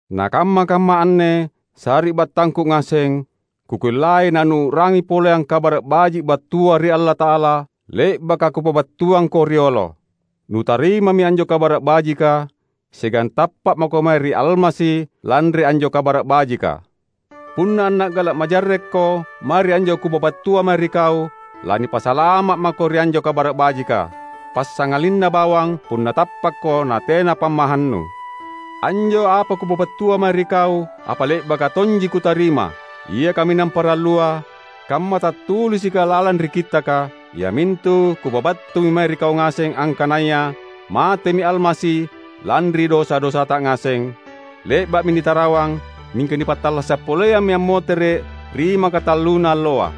Na kamma-kamma anne, sari’battangku ngaseng, kukellai nanuu’rangi poleang Kabara’ Baji’ battua ri Allata’ala, le’baka kupabattuangko riolo. Nutarimami anjo Kabara’ Bajika, siagang tappa’ mako mae ri Almasi lanri anjo Kabara’ Bajika. Punna anna’gala’ majarrekko mae ri anjo kupabattua mae ri kau, lanipasalama’ mako ri anjo Kabara’ Bajika; passangalinna bawang punna tappakko natena pammahannu. Anjo apa kupabattua mae ri kau, apa le’baka tonji kutarima. Ia kaminang parallua, kamma tattulisika lalang ri Kittaka, iamintu kupabattumi mae ri kau ngaseng angkanaya matemi Almasi lanri dosa-dosata ngaseng; le’ba’mi nitarawang, mingka nipattallasa’ poleammi ammotere’ ri makatalluna alloa.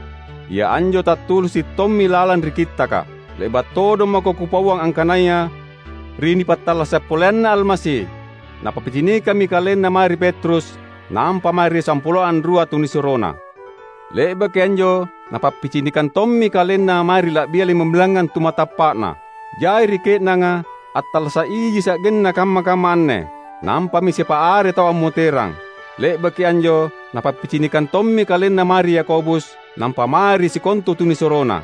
Ia anjo tattulisi’ tommi lalang ri Kittaka. Le’ba’ todong mako kupauang angkanaya ri nipattallasa’ poleanna Almasi, Napappicinikammi KalenNa mae ri Petrus, nampa mae ri sampuloa anrua tunisuroNa. Le’baki anjo Napappicinikang tommi KalenNa mae ri la’bia limambilangngang tu matappa’Na. Jai ri ke’nanga attallasa’ iji sa’genna kamma-kamma anne, nampami siapa are tau ammoterang. Le’baki anjo Napappicinikang tommi KalenNa mae ri Yakobus, nampa mae ri sikontu tunisuroNa.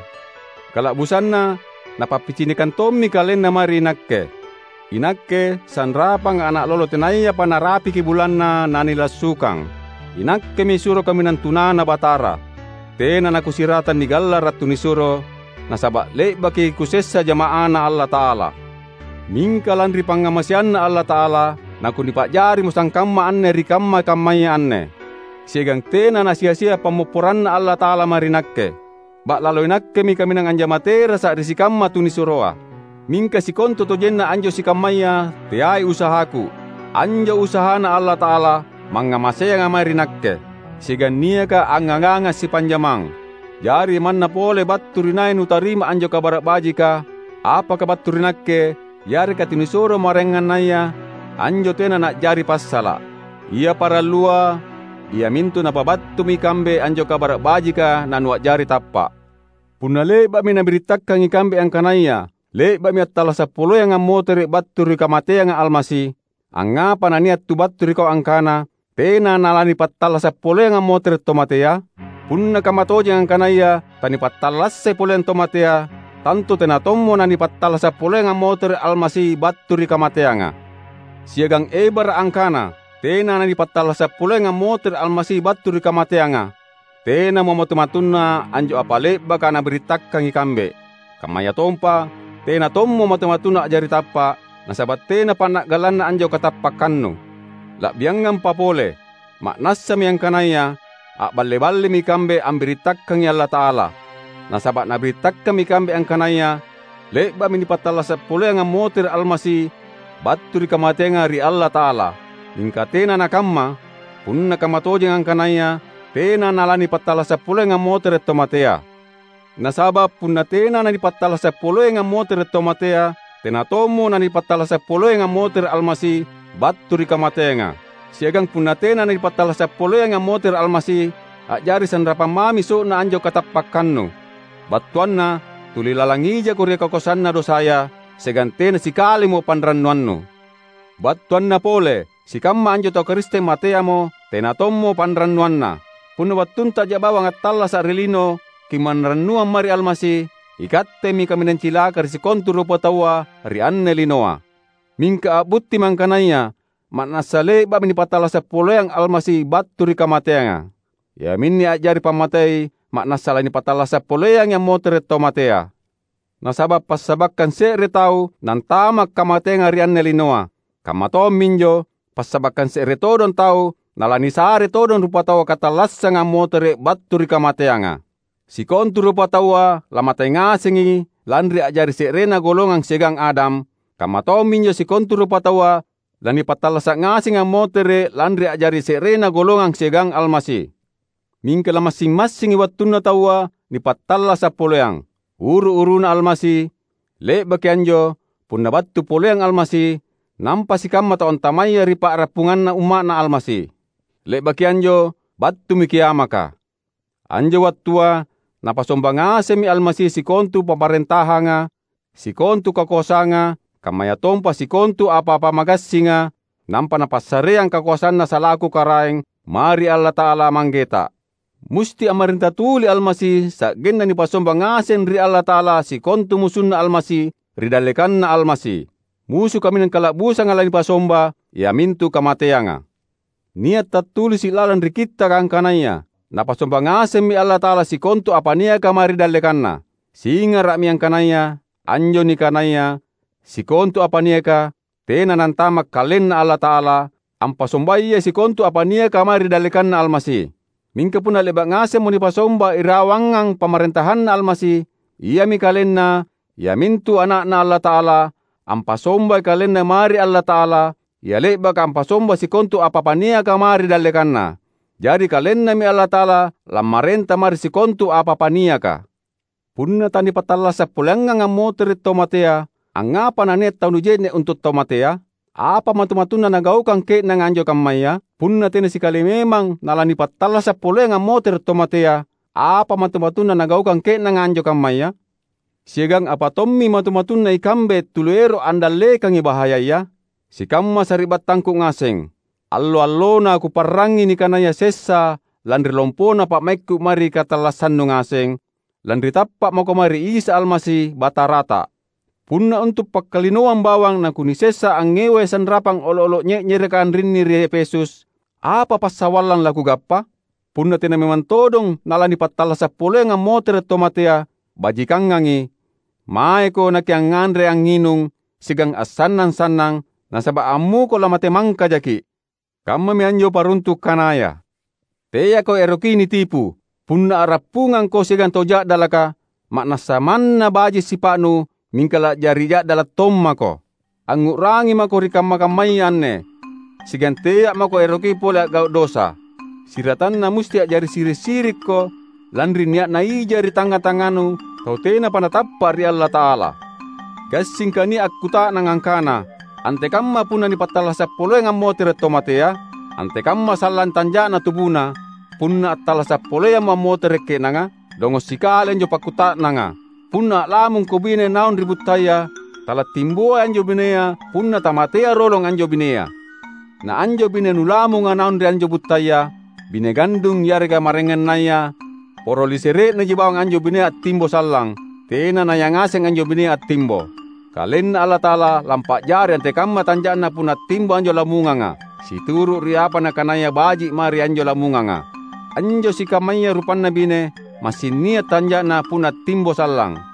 Kala’busanna Napappicinikang tommi KalenNa mae ri inakke — inakke sanrapanga’ ana’ lolo tenayapa narapiki bulanna nanilassukang! Inakkemi suro kaminang tunaNa Batara. Tena nakusiratang nigallara’ tunisuro, nasaba’ le’baki kusessa jama’aNa Allata’ala. Mingka lanri pangngamaseanNa Allata’ala, nakunipa’jarimo sangkamma anne ri kamma-kammaya anne. Siagang tena nasia-sia pammopporanNa Allata’ala mae ri nakke. Ba’lalo inakkemi kaminang anjama terasa’ ri sikamma tunisuroa. Mingka sikontutojenna anjo sikammaya teai usahaku; anjo usahaNa Allata’ala, mangngamaseanga mae ri nakke, siagang niaka angngaganga’ sipanjamang. Jari, manna pole battu ri nai nutarima anjo Kabara’ Bajika — apaka battu ri nakke yareka tunisuro maraengannaya — anjo tena na’jari passala’. Ia parallua iamintu napabattumi ikambe anjo Kabara’ Bajika nanua’jari tappa’. Punna le’ba’mi nabirittakang ikambe angkanaya le’ba’mi attallasa’ poleang ammotere’ battu ri kamateanga Almasi, angngapa nania’ tu battu ri kau angkana tena nalanipattallasa’ poleang ammotere’ tau matea? Punna kammatojeng angkanaya tanipattallassai poleang tau matea, tantu tena tommo nanipattallasa’ poleang ammotere’ Almasi battu ri kamateanga. Siagang ebara’ angkana tena nanipattallasa’ poleang ammotere’ Almasi battu ri kamateanga, tenamo matu-matunna anjo apa le’baka nabirittakang ikambe; kammayatompa tena tommo matu-matunnu a’jari tappa’, nasaba’ tena panna’galanna anjo katappakkannu. La’biangampa pole, ma’nassami angkanaya a’balle-ballemi ikambe ambirittakangi Allata’ala; nasaba’ nabirittakammi ikambe angkanaya le’ba’mi nipattallasa’ poleang ammotere’ Almasi battu ri kamateanga ri Allata’ala, mingka tena nakamma — punna kammatojeng angkanaya tena nalanipattallasa’ poleang ammotere’ tau matea! Nasaba’ punna tena nanipattallasa’ poleangi ammotere’ tau matea, tena tommo nanipattallasa’ poleangi ammotere’ Almasi battu ri kamateanga. Siagang punna tena nanipattallasa’ poleangi ammotere’ Almasi, a’jari sanrapang mami so’na anjo katappakkannu; battuanna tuli lalang ijako ri kakoasanna dosaya, siagang tena sikalimo panrannuannu. Battuanna pole, sikamma anjo tau Karisteng mateamo, tena tommo panrannuanna. Punna ri wattuntaja bawang attallasa’ ri lino kimanrannuang mae ri Almasi, ikattemi kaminang cilaka ri sikontu rupataua ri anne linoa! Mingka a’buttimi angkanaya ma’nassa le’ba’mi nipattallasa’ poleang Almasi battu ri kamateanga. Iaminne a’jari pammatei ma’nassa lanipattallasa’ poleangi ammotere’ tau matea. Nasaba’ passabakkang se’re tau nantama’ kamateanga ri anne linoa; kamma tomminjo, passabakkang se’rea todong tau nalanisare todong rupataua katallassanga ammotere’ battu ri kamateanga. Sikontu rupataua lamate ngasengi lanri a’jari se’rena golongang siagang Adam, kamma tomminjo sikontu rupataua lanipattallasa’ ngasengi ammotere’ lanri a’jari se’rena golongang siagang Almasi. Mingka la’massing-massingi wattunna taua nipattallasa’ poleang: uru-uruna Almasi; le’baki anjo, punna battu poleang Almasi, nampa sikamma tau antamaya ri pa’rappunganna umma’Na Almasi. Le’baki anjo battumi kiamaka. Anjo wattua Napasomba ngasemmi Almasi sikontu pamarentahanga, sikontu kakoasanga, kammayatompa sikontu apa-apa magassinga; nampa Napassareang kakoasanNa salaku Karaeng, mae ri Allata’ala, Manggeta. Musti ammarenta tuli Almasi sa’genna nipasomba ngaseng ri Allata’ala sikontu musunNa Almasi ri dallekanNa Almasi. Musu kaminang kala’busanga lanipasomba, iamintu kamateanga. Nia’ tattulisi’ lalang ri Kittaka angkanaya, "Napasomba ngasemmi Allata’ala sikontu apa niaka mae ri dallekanNa." Singara’mi angkanaya, anjo nikanaya "sikontu apa niaka" tena nantama’ KalenNa Allata’ala, ampasombayai sikontu apa niaka mae ri dallekanNa Almasi. Mingka punna le’ba’ ngasemmo nipasomba irawangang pamarentahanNa Almasi, iami KalenNa, iamintu Ana’Na Allata’ala, ampasombai KalenNa mae ri Allata’ala, Ia le’baka ampasombai sikontu apa-apa niaka mae ri dallekanNa. Jari KalenNami Allata’ala lammarenta mae ri sikontu apa-apa niaka. Punna tanipattallasa’ poleangang ammotere’ tau matea angngapa nania’ tau nije’ne’ untu’ tau matea? Apa matu-matunna nagaukang ke’nanga anjo kammaya? Punna tena sikali memang nalanipattallasa’ poleang ammotere’ tau matea, apa matu-matunna nagaukang ke’nanga anjo kammaya? Siagang apa tommi matu-matunna ikambe tuli ero’ andallekangi bahayaya? Sikamma sari’battangku ngaseng! Allo-allona kuparrangi nikanaya sessa lanri lompona pa’maikku mae ri katallassannu ngaseng, lanri tappa’ mako mae ri Isa Almasi, Batarata. Punna untu’ pakkalinoang bawang nakunisessa angngewai sanrapang olo’-olo’ nye’nyereka anrinni ri Efesus, apa passawallang lakugappa? Punna tena memang todong nalanipattallasa’ poleang ammotere’ tau matea, bajikangangi: "Maeko nakiangnganre-angnginung siagang assannang-sannang, nasaba’ ammuko lamate mangkajaki’"; kammami anjo paruntu’ kanaya. Teako eroki nitipu! Punna a’rappungangko siagang tau ja’dalaka, ma’nassa manna baji’ sipa’nu mingka la’jari ja’dala’ tommako. Angngu’rangi mako ri kamma-kammaya anne, siagang tea’ mako eroki pole a’gau’ dosa. Siratanna musti a’jari siri’-sirikko lanri nia’na ija ri tangnga-tangnganu tau tenapa natappa’ ri Allata’ala. Gassingka nia’ akkuta’nang angkana, "Antekamma punna nipattallasa’ poleang ammotere’ taua matea? Antekamma sallang tanja’na tubuna, punna attallasa’ poleammo ammotere’ ke’nanga?" Dongo’ sikali anjo pakkuta’nanga! Punna a’lamungko bine naung ri buttaya, talattimboai anjo binea punna tamatea rolong anjo binea. Na anjo bine nulamunga naung ri anjo buttaya — bine gandung yareka maraengannaya — poro lisere’naji bawang anjo binea attimbo sallang; tena nayangaseng anjo binea attimbo. KalenNa Allata’ala lampa’jari antekamma tanja’na punna attimbo anjo lamunganga, situru’ ri apa Nakanaya baji’ mae ri anjo lamunganga. Anjo sikammaya rupanna bine, massing nia’ tanja’na punna attimbo sallang.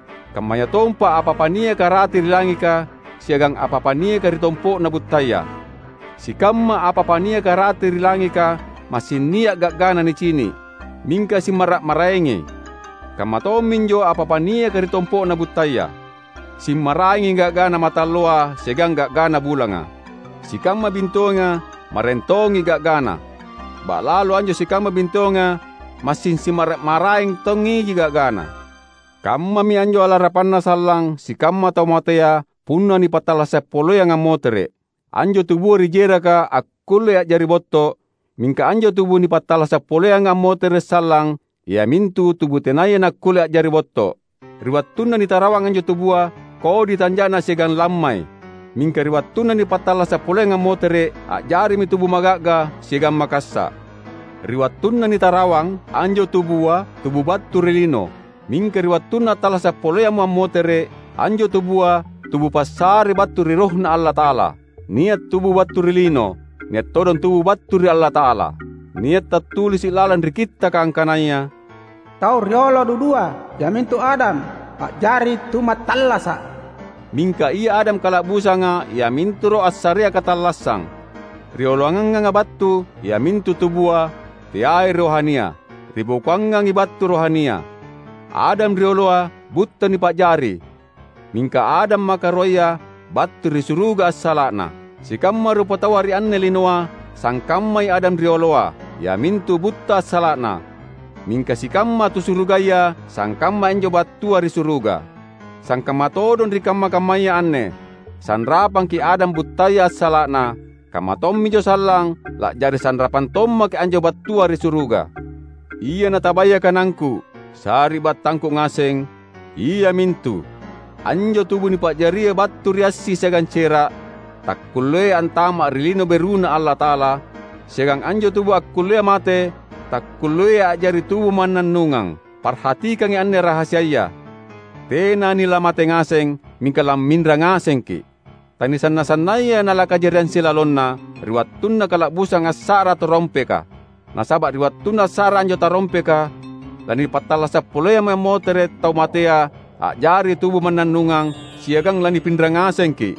Kammayatompa apa-apa niaka rate ri langika siagang apa-apa niaka ri tompo’na buttaya. Sikamma apa-apa niaka rate ri langika massing nia’ ga’gana nicini’, mingka simmara’-maraengi; kamma tomminjo apa-apa niaka ri tompo’na buttaya. Simmaraengi ga’gana mataalloa siagang ga’gana bulanga. Sikamma bintoenga maraeng tongi ga’gana. Ba’lalo anjo sikamma bintoenga massing simmara’-maraeng tongiji ga’gana. Kammami anjo alarapanna sallang sikamma tau matea punna nipattallasa’ poleang ammotere’. Anjo tubua ri jeraka akkullei a’jari botto’, mingka anjo tubu nipattallasa’ poleanga ammotere’ sallang, iamintu tubu tenaya nakkulle a’jari botto’. Ri wattunna nitarawang anjo tubua, kodi tanja’na siagang lammai; mingka ri wattunna nipattallasa’ poleang ammotere’, a’jarimi tubu maga’ga siagang makassa’. Ri wattunna nitarawang, anjo tubua, tubu battu ri lino; mingka ri wattunna attallasa’ poleammo ammotere’, anjo tubua, tubu passare battu ri RohNa Allata’ala. Nia’ tubu battu ri lino, nia’ todong tubu battu ri Allata’ala. Nia’ tattulisi’ lalang ri Kittaka angkanaya, "tau riolo dudua, iamintu Adam, a’jari tu mattallasa’," mingka ia Adam kala’busanga iamintu Roh assarea katallassang. Rioloanganga battu iamintu tubua, teai rohania. Ri bokoangangi battu rohania. Adam rioloa butta nipa’jari, mingka Adam makaruaya battu ri suruga assala’na. Sikamma rupataua ri anne linoa sangkammai Adam rioloa, iamintu butta assala’na; mingka sikamma tu surugaya sangkammai anjo battua ri suruga. Sangkamma todong ri kamma-kammaya anne sanrapangki’ Adam buttaya assala’na, kamma tomminjo sallang la’jari sanrapang tommaki’ anjo battua ri suruga. Ia natabaya kanangku, sari’battangku ngaseng, iamintu: anjo tubu nipa’jaria battu ri assi siagang cera’, takkulleai antama’ ri Lino BeruNa Allata’ala; siagang anjo tubu akkullea mate takkulleai a’jari tubu mannannungang. Parhatikangi anne rahasiaya: tena nilamate ngaseng, mingka lamminra ngasengki’. Tanisanna-sannayai nalakajariang silalonna, ri wattunna kala’busang assa’ra tarompeka. Nasaba’ ri wattunna assa’ra anjo tarompeka, lanipattallasa’ poleammi ammotere’ tau matea a’jari tubu mannannungang, siagang lanipinra ngasengki’.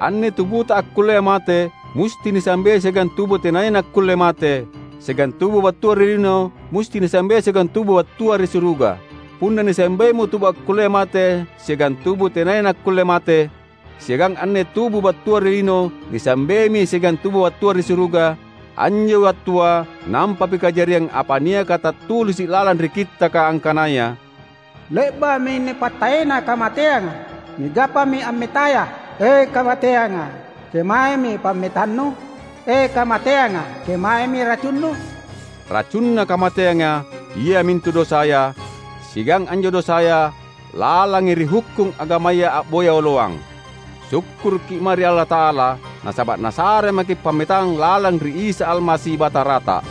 Anne tubuta akkullea mate musti nisambei siagang tubu tenaya nakkulle mate; siagang tubu battua ri lino musti nisambei siagang tubu battua ri suruga. Punna nisambeimo tubu akkullea mate siagang tubu tenaya nakkulle mate, siagang anne tubu battua ri lino nisambeimi siagang tubu battua ri suruga, anjo wattua nampami kajariang apa niaka tattulisi’ lalang ri Kittaka angkanaya, "Le’ba’mi nipattaena kamateanga; nigappami ammetaya!" "E, kamateanga, kemaemi pammetannu? E, kamateanga, kemaemi racunnu?" Racunna kamateanga, iamintu dosaya, siagang anjo dosaya lalangi ri hukkung agamaya a’boya oloang. Sukkurukki’ mae ri Allata’ala; nasaba’ Nasare maki’ pammetang lalang ri Isa Almasi, Batarata!